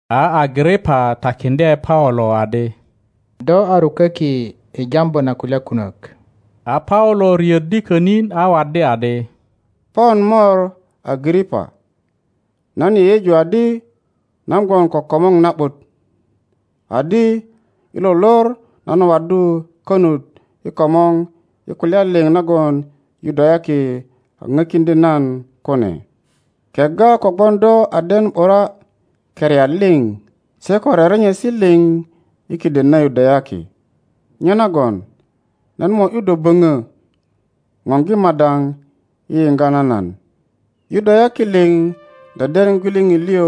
A Agripa takiŋdye Paulo adi, Do a ruköki i jambu na kulya kunök. A Paulo riöddi könin a waddi adi. Pon mor Agripa, nan yeyeju adi nan gwon ko komor na ’but, adi i lo lor nan waddu konut i komor i kulya liŋ nagon Yudayaki a ŋökiudye nan kune, kegga kogwon do a den ’bura keriat liŋ se ko rerenyesi liŋ i kiden na Yudayaki. Nyenagon nan mo ’yu do böŋö, ŋoŋgi madaŋ i yoŋga na nan. Yudayaki liŋ deden gwiliŋit liŋ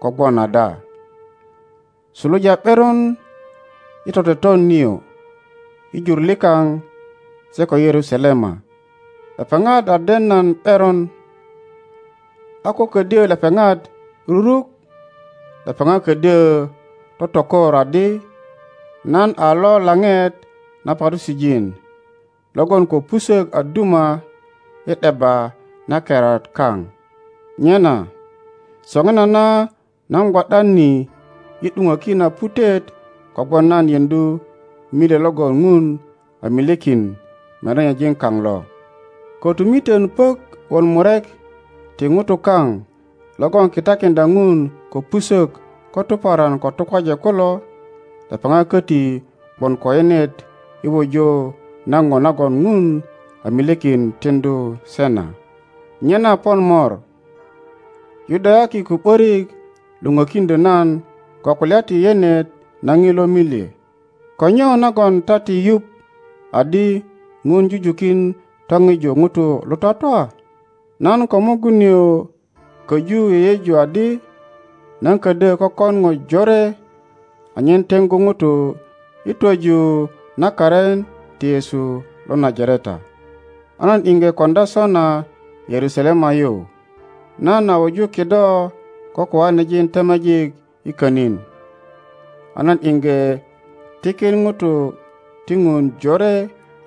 ko gwon ada suluja ’beron i toteton nio i jur likaŋ se ko i Yerusalema. Lepeŋat a den nan ’beron; a ko ködyö lepeŋat ruruk, lepeŋat ködyö totokor adi nan a lo laŋet na Parusijin logon ko pusök a duma i ’debba na keriat kaŋ. Nyena soŋinana nan gwo ’dan ni i ’duŋöki na putet kogwon nan yeŋdu milye logon Ŋun a milyekin merenyejin kaŋ lo; kötumitön puök wot murek ti ŋutu kaŋ logon kitakiŋdya Ŋun ko pusök ko tuparan ko tukwaje kulo, lepeŋat köti gwon ko yenet i wuju na po nagon ŋun a milyekin tiŋdu se na. Nyena pon mor, Yudayaki ko ’börik lo pökiŋdyö nan ko kulya ti yenet na ŋilo milye. Ko nyo nagon ta ti yuŋ adi ŋun jujukin topiju ŋutu lo twatwa? Nan ko mugun nio köju yeyeju adi nan ködyö kökon po jore anyen teŋgu ŋutu i twöju na karin ti Yesu lo Najareta. A nan iŋge koŋdya sona Yerusalema yu. Nan a wuju kido ko koanejin temejik i könin, a nan iŋge tikin ŋutu ti Ŋun jore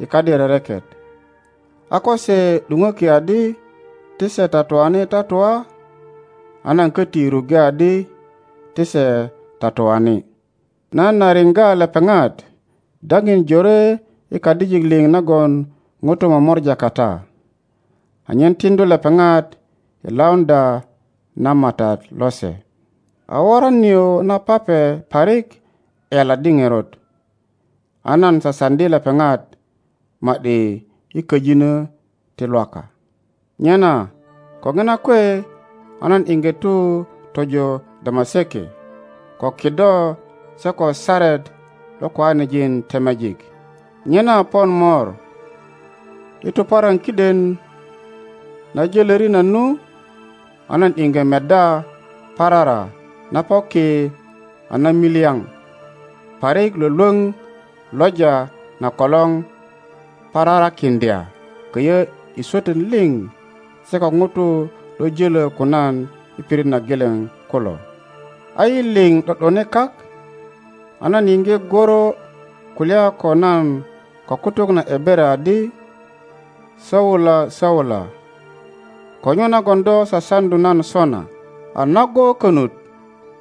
i kadi rereket, a ko se ’dupöki adi ti se tatuani tatua a nan köti ruŋge adi ti se tatuani. Nan a riŋga lepeŋat dapin jore i kadijik liŋ nagon ŋutu momora kata, anyen tiŋdu lepeŋat i lauŋdya na Matat lose. A woran nio na pape parik ’yaladdi ŋerot, a nan sasaŋdi lepeŋat ma ’di i köjinö ti Lwaka. Nyena ko ŋina kwe a nan iŋge tu tojo Damaseke ko kido se ko saret lo koanejin temejik. Nyena pon mor, i tuparan kiden na jölöri nan nu, a nan iŋge meddya parara na po ki a namilyaŋ parik lwölwöŋ loja na kolor pararakiŋdya köyö i swötön liŋ se ko ŋutu lo jölö ko nan i pirit na geleŋ kulo. A yi liŋ ’do ’done kak, a nan yiŋge gworo kulya ko nan ko kutuk na Ebere adi, Saula, Saula, ko nyo nagon do sasaŋdu nan sona? A nago konut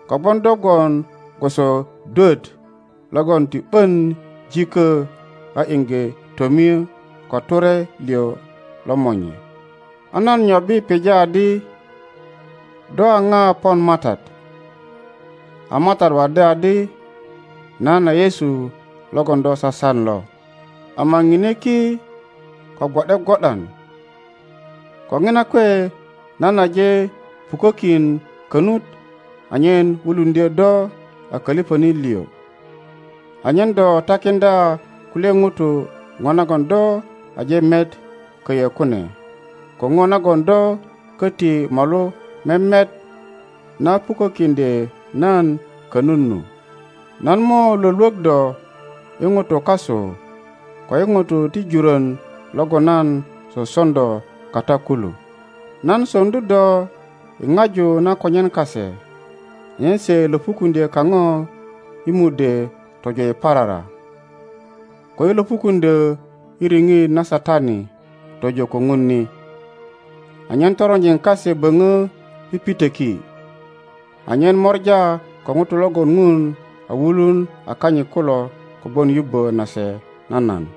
kogwon do gwon gwoso dwöt logon ti ’bön jikö a iŋge tomie ko ture liŋ lo monye. a nan nyobbi pija adi, Do a ŋa pon Matat? A Matat waddi adi, Nan a Yesu logon do sasan lo. Ama ŋine ki ko gwo ’de gwo ’dan. Ko ŋina kwe nan aje pukökin konut anyen wuluŋdyö do a köliŋönit liŋ, anyen do takiŋdya kulye ŋutu ŋo nagon do aje met köyö kune ko ŋo nagon do köti molu memet na puökkiŋdye nan konut nu. Nan mo lwölwök do i ŋutu kasu ko i ŋutu ti jurön logon nan soson do kata kulu. Nan soŋdu do i ŋaju na konyen kase anyen se löpukuŋdyö kaŋo i mudwe tojo i parara, ko i löpukuŋdyö i riŋit na Satani tojo ko Ŋun ni, anyen toronjin kase böŋö pipitöki, anyen mora ko ŋutu logon Ŋun a wulun a kanyit kulo kogwon yubbö nase na nan.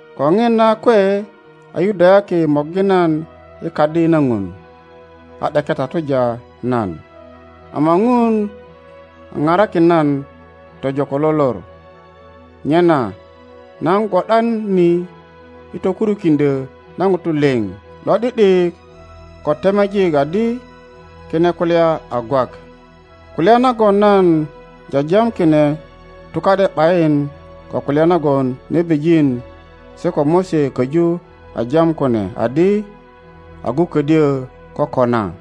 Ko ŋina kwe a Yudayaki morgi nan i Kadi na Ŋun, a ’deke tatuja nan. Ama Ŋun a parakin nan tojo ko lo lor, nyena nan gwo ’dan ni i tokurukiŋdyö na ŋutu liŋ lo ’di ’dik ko temejik adi kine kulya a gwak. Kulya nagon nan jajam kine tuka ’de ’bayin ko kulya nagon nebijin se ko Mose köju a jam kune adi agu ködyö kokona;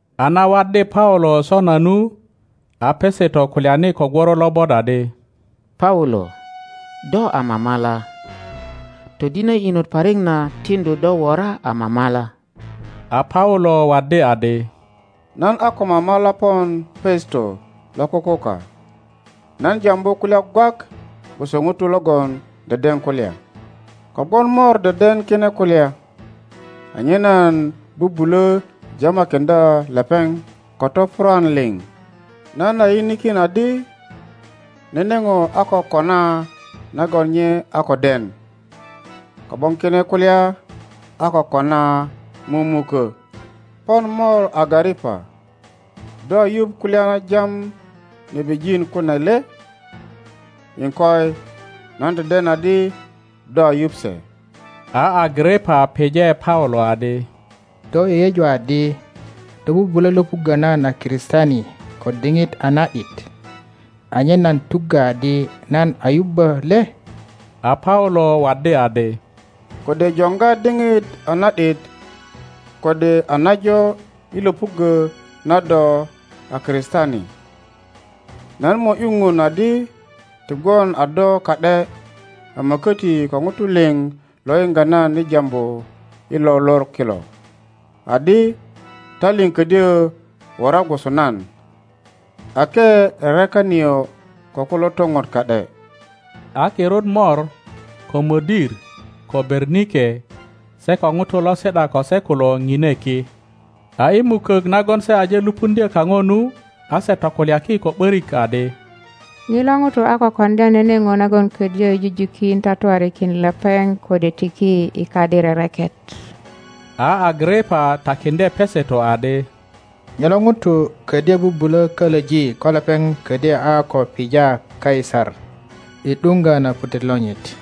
A na waddi Paulo sona nu, a Peseto kulyani ko gworo lobot adi, Paulo, do a mamala! Todinö inot parik na tiŋdu do wora a mamala! a Paulo waddi adi, Nan a ko mamala pon Peseto lo kukuka, nan jambu kulya gwak gwoso ŋuto logon deden kulya, Kogwon mor deden kine kulya, anyen nan bubulö jamakiŋdya lepeŋ ko topurwan liŋ. Nan a yinikin adi nene ŋo a ko kona nagon nye a ko den, kogwon kine kulya a ko kona mumukö. Pon mor Agaripa, do a yuŋ kulya na jam nebijin kune le? Iŋkoi, nan deden adi do a yuŋ se. a Agaripa pije Paulo adi, Do yeyeju adi do bubulö löpuggö nan a Kristiani ko diŋit a na ’dit, anyen nan tuggö adi nan a yubbö le? a Paulo waddi adi, Kode joŋga diŋit a na ’dit kode a najo i löpuggö na do a Kristiani, nan mo ’yu Ŋun adi ti gwon a do ka ’de ama köti ko ŋutu liŋ lo yiŋga nan i jambu i lo lor kilo, adi ta liŋ ködyö wora gwoso nan, ake rereka nio ko kulo toŋot ka ’de. A kirut mor, ko mödir, ko Bemike, se ko ŋutu lo si ’da ko se kulo ŋine ki; a i mukök nagon se aje lupuŋdyö kaŋo nu, a se tokulyaki ko ’börik adi, Ŋilo ŋuto a ko koŋdya nene ŋo nagon ködyö jujukin tatuarikin lepeŋ kode tiki i kadi rereket. a Agaripa takiŋdye Peseto adi, Ŋilo ŋuto ködyö bubulö kölöji ko lepeŋ ködyö a ko pija Kaisar i ’duŋgö na putet lonyit.